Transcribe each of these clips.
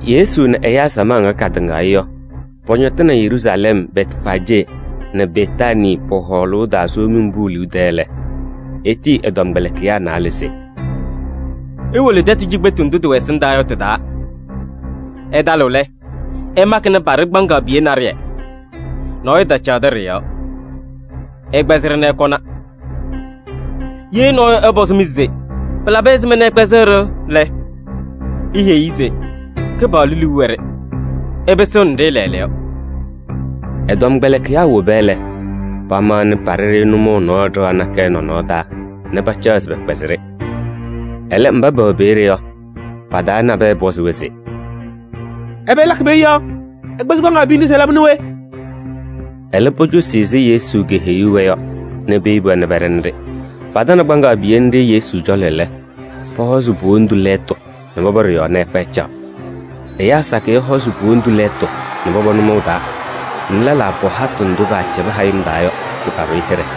Yesu nɛ ɛyaa samaɣ ŋga katɩŋaɣ-ɩ yɔ, pɔñɔtɩnɩ Yeruusalɛm Bɛtfaajee nɛ Betaanii pɔ-hɔɔlʋʋ taa Somiŋ Pʋʋ liu tɛɛ lɛ, etiyi ɛ-tɔmkpɛlɩkɩyaa naalɛ se: “Iwolo tɛtʋ cikpetu ndʋ tɩwɛ ɛsɩndaa yɔ tɩ-taa. Ɩtalɩɣ lɛ, ɩmakɩnɩ paɖɩ kpaŋaɣ piye naɖɩyɛ. Nɔɔyʋ tacaɣdɩ ɖɩ-yɔɔ. Ɩkpɛzɩ-ɖɩ nɛ ɩkɔna. Ye nɔɔyʋ ɛpɔzɩ-mɩ se: ‘Pɩlabɩ ɛzɩma nɛ ɩkpɛzɩɣ-ɖɩ’ lɛ, iheyi-i se: ‘Kɩpaɣlʋ liu wɛ-ɖɩ, ɩpɩsɩɣnɩ-ɖɩ lɛɛlɛɛyɔ.’” Ɛ-tɔmkpɛlɩkɩyaa woba lɛ, pamaɣnɩ paɖɩ-ɖɩ nʋmɔʋ nɔɔ ɖɩɣa nakɛyɛ nɔnɔɔ taa nɛ pacaɣ se pɛkpɛzɩ-ɖɩ. Ɛlɛ mba pɛwɛ peeye yɔ, pa-taa nabɛyɛ pɔzɩ-wɛ se: “Ɛbɛ ɩlakɩ peeye yɔ? Ɩkpɛzɩɣ kpaŋaɣ piye nɖɩ se ɩlabɩnɩ we?” Ɛlɛ, pocosi ɛzɩ Yesu keheyuu-wɛ yɔ nɛ peyebi-wɛ nɛ pɛɖɛnɩ-ɖɩ. Patanɩ kpaŋaɣ piye nɖɩ Yesu cɔlɔ lɛ, pɔhɔzɩ po-wondu lɛɛtʋ nɛ pɔpɔ ɖɩ-yɔɔ nɛ ɛkpa ɛcaɣ. Ɛyaa sakɩyɛ hɔzɩ po-wondu lɛɛtʋ nɛ pɔpɔ nʋmɔʋ taa nɛ lɛlaa pɔ hatʋ ndʋ paacɛbɩ hayɩm taa yɔ se paɖʋ-ɩ hɩɖɛ.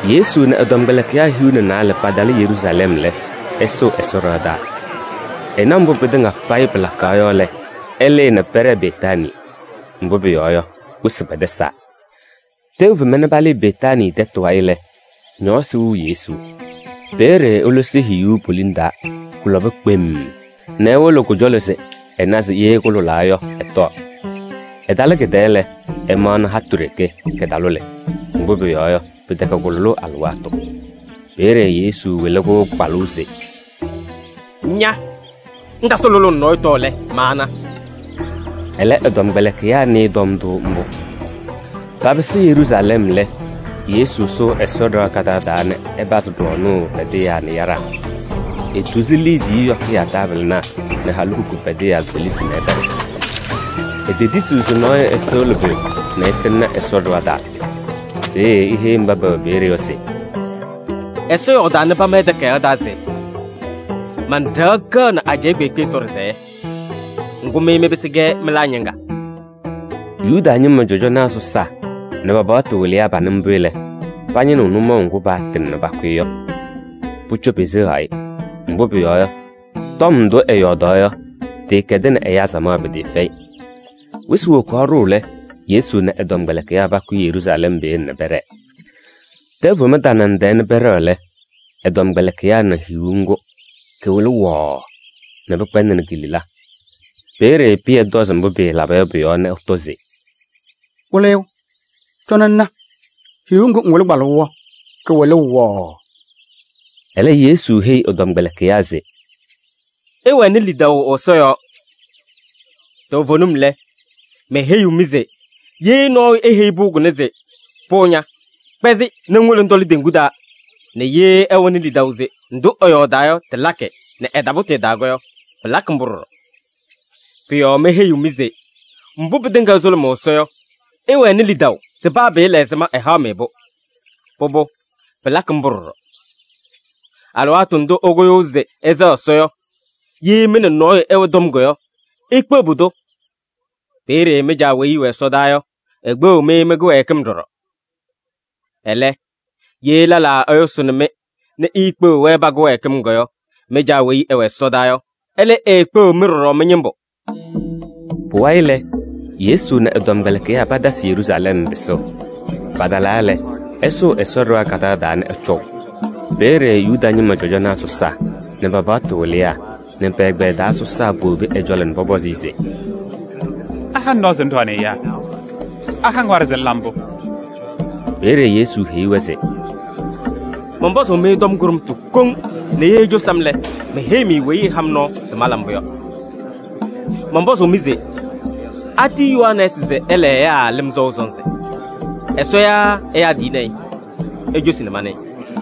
Yesu nɛ ɛ-tɔmkpɛlɩkɩyaa hiu nɛ naalɛ patalɩ Yeruusalɛm lɛ, ɛsʋʋ Ɛsɔ ɖɩɣa taa. Ɛna mbʋ pɩtɩŋa payɩ pɩlakaɣ yɔ lɛ, ɛlɩɩ nɛ pɛɖɛɛ Betaanii. Mbʋ pʋyɔɔ yɔ, wɩsɩ kpɛdɛsaa. Tɛʋ fema nɛ palɩɩ Betaanii tɛtʋ wayɩ lɛ, ñɔɔsɩ wɩɣ Yesu. Peeye elosi hiyuu poliŋ taa, kʋlɔba kpemm nɛ ewolo kʋ-cɔlɔ se ɛna se ye kʋlʋlaa yɔ, ɛtɔɔ. Ɛtalɩ kɩ-tɛɛ lɛ, ɛmaɣnɩ hatʋ ɖeke, kɩtalʋlɩ. Mbʋ pʋyɔɔ yɔ, pɩtɛkɛ kʋ-lʋlʋʋ alɩwaatʋ. Peeye Yesu wɩlɩ-kʋ kpalʋʋ se: “Ña! Ŋtasɩ lʋlʋʋ nɛ nɔɔyʋ tɔɔ lɛ, maana.” Ɛlɛ, ɛ-tɔmkpɛlɩkɩyaa nɩɩ tɔm ndʋ mbʋ. Papɩsɩ Yeruusalɛm lɛ, Yesu sʋʋ Ɛsɔ ɖɩɣa kadaɣ taa nɛ ɛpazɩ ɖɔɔnʋʋ pɛdɩyaa nɛ yaɖaa. Etuzi liidiye yɔkɩyaa taabɩlɩnaa nɛ halikukunaa pɛdɩyaa kpelisi nɛ ɛpɛɖɩ. Etetisiɣ se nɔɔyʋ ɛsɩɣlɩ pʋyʋ nɛ ɛtɩŋnɩ Ɛsɔ ɖɩɣa taa. Peeye eheyi mba pɛwɛ peeye yɔ se: “Ɛsɔ yɔɔdaa nɛ pama ɛ-takayaɣ taa se: ‘Man-ɖɩɣa kɛɣnɩ ajɛɛ kpeekpe Ɛsɔ ɖɩsɛyɛ.’ Ŋgʋ, mɩ mɩpɩsɩ-kɛ mɩlaa ñɩŋga.” Yuda ñɩma cɔjɔnaa sɔsaa nɛ pa-paɣtʋ wɩlɩyaa panɩ mbʋ lɛ, pañɩnɩɣ nʋmɔʋ ŋgʋ paatɩŋ nɛ pakʋ-ɩ yɔ. Pʋcɔ peseɣaɣ-ɩ, mbʋ pʋyɔɔ yɔ, tɔm ndʋ ɛyɔɔdaɣ yɔ, tɩɩkɛdɩnɩ ɛyaa samaɣ pɩtɩɩfɛyɩ. Wɩsɩ wokaɣ ɖʋʋ lɛ, Yesu nɛ ɛ-tɔmkpɛlɩkɩyaa pakʋyɩ Yeruusalɛm peeye nɛ pɛɖɛɛ. Tɛʋ fem tanaŋ tɛɛ nɛ pɛɖɛɣ lɛ, ɛ-tɔmkpɛlɩkɩyaa na hiyuu ŋgʋ, kɩwɩlɩ wɔɔɔ nɛ pɩkpɛndɩnɩ ki-lila. Peeye Pɩyɛ tɔzɩ mbʋ pɩɩlaba yɔ pʋ-yɔɔ nɛ ɛtɔ se: “Wɩlɩyʋ, cɔnɩ ŋna hiyuu ŋgʋ ŋwɩlɩ kpalʋʋ yɔ kɩwɩlʋʋ wɔɔɔ.” Ɛlɛ, Yesu heyi ɛ-tɔmkpɛlɩkɩyaa se: “Ɩwɛnɩ lidaʋ Ɛsɔ yɔɔ. Toovenim lɛ, meheyiɣ-mɩ se ye nɔɔyʋ eheyi pʋʋ kʋnɛ se: ‘Pʋʋ ña, kpɛzɩ nɛ ŋwolo ŋtɔlɩ teŋgu taa’ nɛ ye ɛwɛnɩ lidaʋ se ndʋ ɛyɔɔdaa yɔ tɩlakɩ nɛ ɛtapʋtɩ ɛ-taa yɔ, pɩlakɩ mbʋ ɖɔɖɔ. Pʋ-yɔɔ meheyiɣ-mɩ se mbʋ pɩtɩŋa ɩsʋlʋmʋʋ Ɛsɔ yɔ, ɩwɛnɩ lidaʋ se paa pɩɩla ɛzɩma, ɛhaɣ-mɩ-pʋ. Pʋbʋ, pɩlakɩ mbʋ ɖɔɖɔ. Alɩwaatʋ ndʋ ɩkʋyʋʋ se ɩsɛɣ Ɛsɔ yɔ, ye mɩ nɛ nɔɔyʋ ɩwɛ tɔm yɔ, ikpeɣ pʋdʋ. Peeye mɩ-Caa weyi ɛwɛ ɛsɔdaa yɔ, ekpeɣiɣ-mɩ mɩ-kɩwɛɛkɩm ɖɔɖɔ. [ Ɛlɛ, ye lɛlaa ɛyʋsʋʋnɩ-mɩ nɛ iikpeɣiɣ-wɛ pa-kɩwɛɛkɩm yɔ, mɩ-Caa weyi ɛwɛ ɛsɔdaa yɔ, ɛlɛ eekpeɣiɣ-mɩ ɖɔɖɔ mɩ-ñɩmbʋ.]” Pʋwayɩ lɛ, Yesu nɛ ɛ-tɔmkpɛlɩkɩyaa patasɩ Yeruusalɛm pɩsʋʋ. Patalaa lɛ, ɛsʋʋ Ɛsɔ ɖɩɣa kadaɣ taa nɛ ɛcɔʋ. Peeye Yuda ñɩma cɔjɔnaa sɔsaa nɛ pa-paɣtʋ wɩlɩyaa nɛ pɛ-ɛgbɛyɛ taa sɔsaa powobi ɛ-cɔlɔ nɛ pɔpɔzɩ-ɩ se: “Aha-ŋ nɔɔ se ŋɖɔɔnɩ ɛyaa? Aha-ŋ waɖɛ se ŋla mbʋ?” Peeye Yesu heyi-wɛ se: “Mɔnpɔzʋʋ-mɩ tɔm kʋɖʋmtʋ koŋ nɛ ye icosi-m lɛ, meheyi-mɩ weyi ɛha-m nɔɔ se mala mbʋ yɔ. Mɔnpɔzʋʋ-mɩ se: atiyi Yohanɛɛsɩ se ɛla ɛyaa lɩm sɔʋ sɔnzɩ? Ɛsɔ yaa ɛyaa tiyini-i? Icosi nɛ manɩɩ.”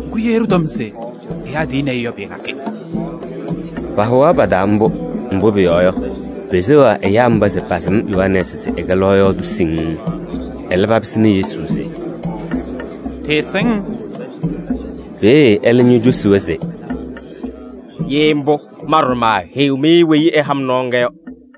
Ŋgʋ, ɖɩtɔm se: ‘Ɛyaa tiyini-i’ yɔ, pɩɩlakɩ.” Pahʋwaɣ pa-taa mbʋ, mbʋ pʋyɔɔ yɔ, peseɣaɣ ɛyaa mba se pasɩm Yohanɛɛsɩ se ɛkɛ lɔɔyaɣ tʋ siŋŋ. Ɛlɛ papɩsɩnɩ Yesu se: “Ɖɩɩsɩŋ.” Peeye ɛlɛ ñocosi-wɛ se: “Ye mbʋ, ma ɖɔɖɔ maaheyiɣ-mɩ weyi ɛha-m nɔɔ ŋga yɔ.”